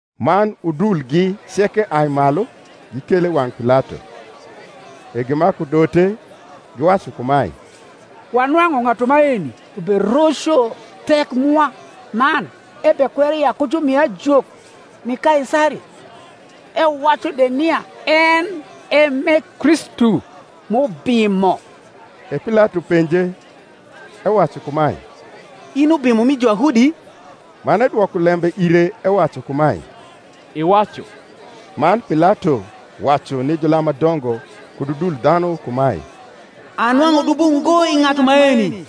Man udulgi ceke ai malu, gikele i wang’ Pilato. E gimaku dote, giwacu kumae, Wanwang’u ng’atu maeni beroco thek mwa, man ebekwero ya ku jumi ajok ni Kaisari, ewacu de nia en e m’e Kristu m’ubimo. E Pilato penje, ewacu kumae, In i Ubimo mi Juyahudi? Man edwoko lembe ire ewacu kumae, Iwacu. Man Pilato wacu ni julam ma dongo kud udul dhanu kumae, Anwang’u dubo ngo i ng’atu maeni.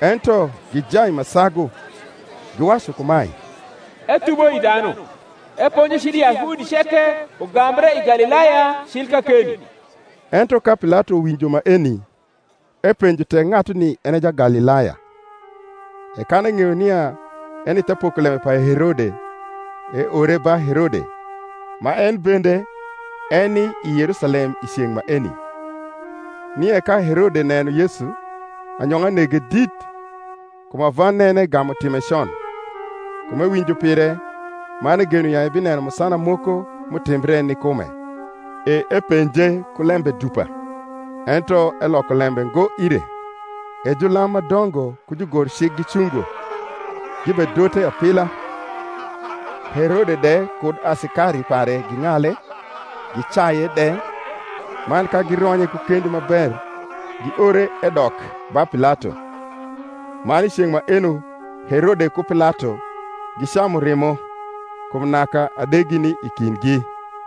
Ento gijai ma sagu, giwacu kumae, Ethubo i dhanu, eponjo cil i Yahudi ceke, ugambre i Galilaya cil kakeni. Ento ka Pilato winjo maeni, epenjo tek ng’atuni en e Jagalilaya. E kan eng’eyo nia eni the pokolembe pa Herode, eore ba Herode, ma en bende eni i Yerusalem i ceng’ maeni. Nie ka Herode neno Yesu, anyong’a nege dit: kum ava nene gamu time con, kum ewinjo pire; man egeno ya ebineno musana moko m’utimbre ni kume. E epenje ku lembe dupa; ento eloko lembe ngo ire. E julam ma dongo ku jugorcik gicungo, gibedote apila. Herode de kud asikari pare ging’ale, gicaye de, man ka gironye ku kendi ma ber giore edok ba Pilato. Man i ceng’ maeno Herode ku Pilato gicamu rimo: kum naka adegi nii kindgi.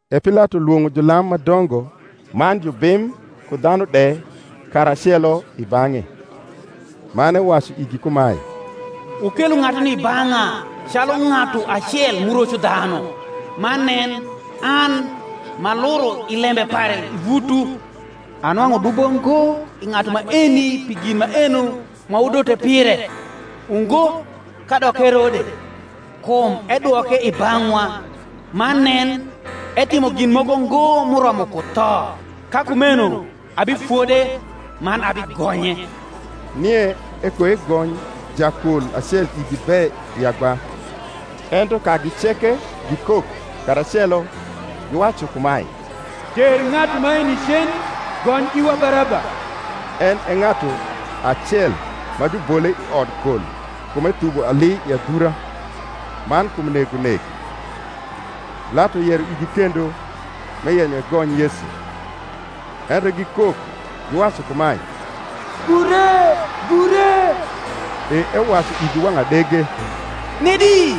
E Pilato lwong’o julam ma dongo man jubim ku dhanu de karacelo i bang’e. man ewacu igi kumae, Wukelo ng’atuni i bang’e calu ng’atu acel m’uroco dhanu: man nen, an, m’aluro i lembe pare i vutwu, anwang’u dubo ngo i ng’atu maeni pi gin maeno ma wudote pire: ungo, kadok Herode: kum edwoke i bang’wa; man nen, etimo gin moko ngo m’uromo ku tho. Ka kumeno abifode, man abigonye. Nie ekoegony jakol acel igi be i agba. Ento kagi ceke gikok karacelo, giwacu kumae, Ter ng’atu maeni cen, gony iwa Baraba: en e ng’atu acel ma jubole i odkol kum ethubo ali i adhura, man kum negonek. Pilato yero igi kendo, m’eyenyo egony Yesu; ento gikok, giwacu kumae, Gure, gure. E ewacu igi wang’ adege, Nedi,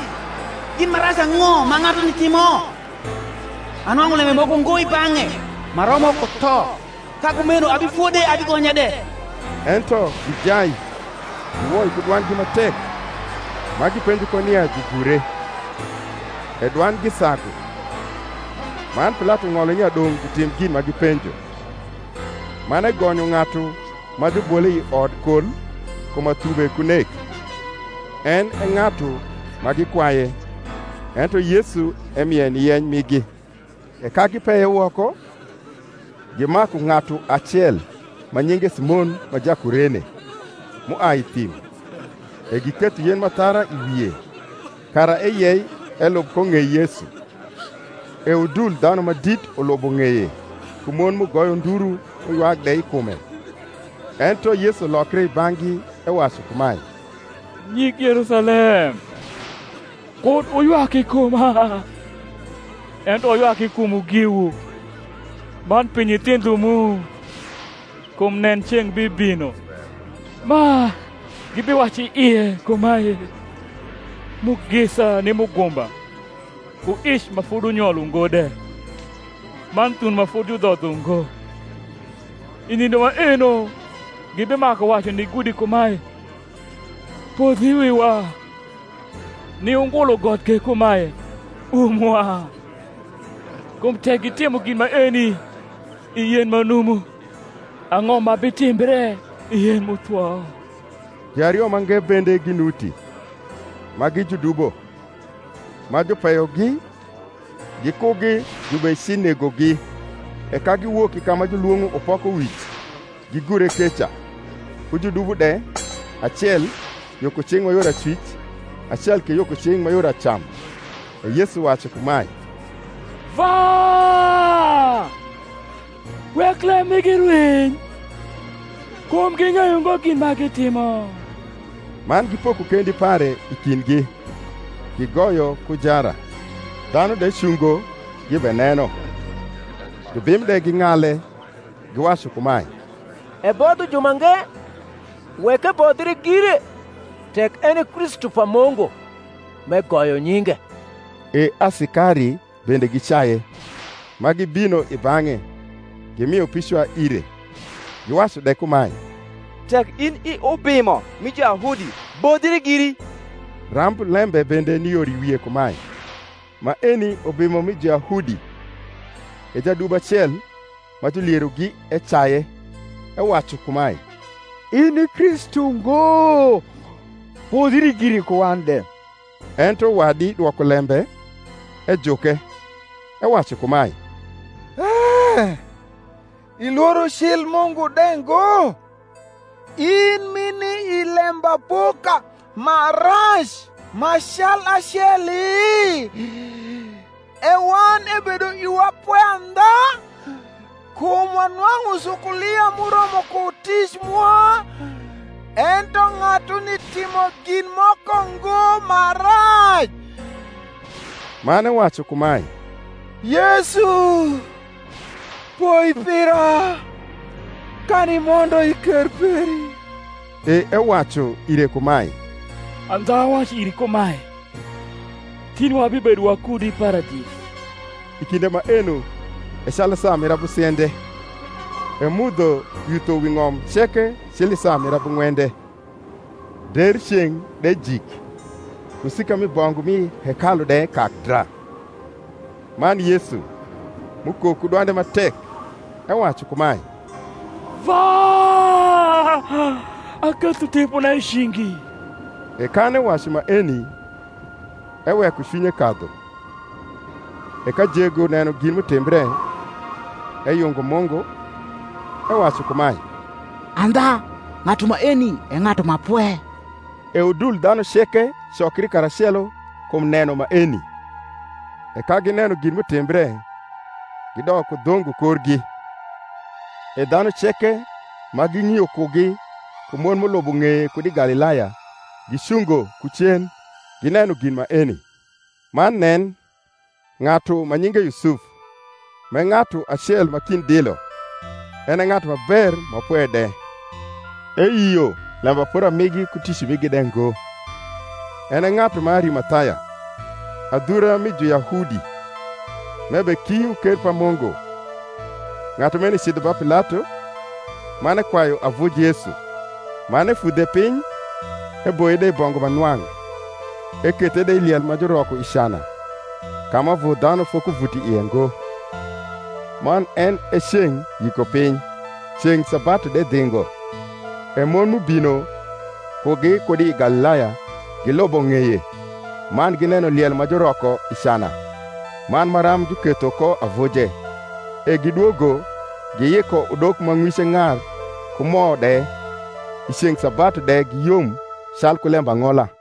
gin ma rac ang’o ma ng’atuni timo? Anwang’u lembe moko ngo i bang’e ma romo ku tho: ka kumeno abifode abigonye de. Ento gijai giwoi ku dwandgi ma tek, ma gipenjo ko nia jugure. E dwandgi sagu. Man Pilato ng’olo nia dong’ jutim gin ma gipenjo. Man egonyo ng’atu ma jubole i odkol kum athube ku nek, en e ng’atu ma gikwaye; ento Yesu emie ni yeny migi. E ka gipeye woko, gimaku ng’atu acel ma nyinge Simon ma Jakurene, m’uai i thim, e giketho yen m’athara i wie, kara eyei elub ko ng’ei Yesu. E udul dhanu ma dit ulubo ng’eye, ku mon m’ugoyo nduru m’uywak de i kume. Ento Yesu lokre i bang’gi ewacu kumae, Nyig Yerusalem, kud wuywak i kuma, ento wuywak i kumwu giwu, man pi nyithindho mu. Kum nen, ceng’ bibino, ma gibiwacu i ie kumae, Mugisa ni mugumba, ku ic ma fodunyol ungo de, man thuno ma fodi judhodho ngo. I nindo maeno gibimaku wacu ni gudi kumae, Podh i wiwa; ni ungulu got ke kumae, Umwa. Kum tek gitimo gin maeni i yen ma numu, ang’o ma bitimbre i yen m’uthwo? Juario mange bende ginuti, ma gi judubo, ma jupeyogi, gikugi jubecinegogi. E ka giwok i ka ma julwong’o Upokowic, gigure keca, ku judubo de, acel yo ku cing’ ma yor acwic acel ke yo ku cing’ ma yor acam. E Yesu wacu kumae, Vwa, wek lem migi rwiny; kum ging’eyo ngo gin ma gitimo. Man gipoko kendi pare i kindgi, gigoyo ku jara. Dhanu de cungo gibeneno. Jubim de ging’ale, giwacu kumae, Ebodho jumange; wek ebodhre gire, tek en e Kristu pa Mungu, m’egoyo nyinge. E asikari bende gicaye, ma gibino i bang’e, gimio picwa ire, giwacu de kumae, Tek in i Ubimo mi Juyahudi, bodhri giri. Ramblembe bende ni yor i wie kumae, MAENI UBIMO MI JUYAHUDI. E jadubo acel ma julierogi ecaye, ewacu kumae, In i Kristu ngo? bodhri giri ku wan de. Ento wadi dwoko lembe, ejuke, ewacu kumae, E ilworo cil Mungu de ngo, in m’ini i lembapoka ma rac ma cal aceli? E wan ebedo iwa pwe andha; kum wanwang’u sukulia m’uromo ku tic mwa: ento ng’atuni timo gin moko ngo ma rac. Man ewacu kumae, Yesu, poi pira kan imondo i ker peri. E ewacu ire kumae, Andha awacu iri kumae, Tin wabibedo wakudi i Paradis. I kinde maeno e calu saa mir abusiende, e mudho yutho wi ng’om ceke cil i saa mir abung’wende, der ceng’ de jik: kusika mi bongu m’i hekalu de kak dra. Man Yesu, m’ukok ku dwande ma tek, ewacu kumae, Vwa, aketho tipona i cingi: e kan ewacu maeni, eweko cwinye kadhu. E ka jego neno gin m’utimbre, eyungo Mungu, ewacu kumae, Andha ng’atu maeni e ng’atu ma pwe. E udul dhanu ceke cokri karacelo kum neno maeni, e ka gineno gin m’utimbre, gidok ku dhongo korgi. E dhanu ceke ma ging’io kugi, ku mon m’ulubo ng’eye kud i Galilaya, gicungo ku cen, gineno gin maeni. Man nen, ng’atu ma nyinge Yusuf, m’e ng’atu acel ma kind dilo, en e ng’atu ma ber ma pwe de (eyio lembapora migi ku tic migi de ngo), en e ng’atu ma Arimathaya, adhura mi Juyahudi, m’ebekio ker pa Mungu: ng’atu maeni cidho ba Pilato, man ekwayu avuj Yesu. Man efudhe piny, eboye de i bongu ma nwang’, ekethe de i liel ma juroko i cana, ka ma avu dhanu fokuvuto i ie ngo. Man en e ceng’ Yikopiny, ceng’ sabatu de dhingo. E mon, m’ubino kugi kud i Galilaya, gilubo ng’eye, man gineno liel ma juroko i cana, man maram juketho ko avuje. E gidwogo, giyiko udok ma ng’wice ng’ar ku mo de. I ceng’ sabatu de giyom calku lembang’ola.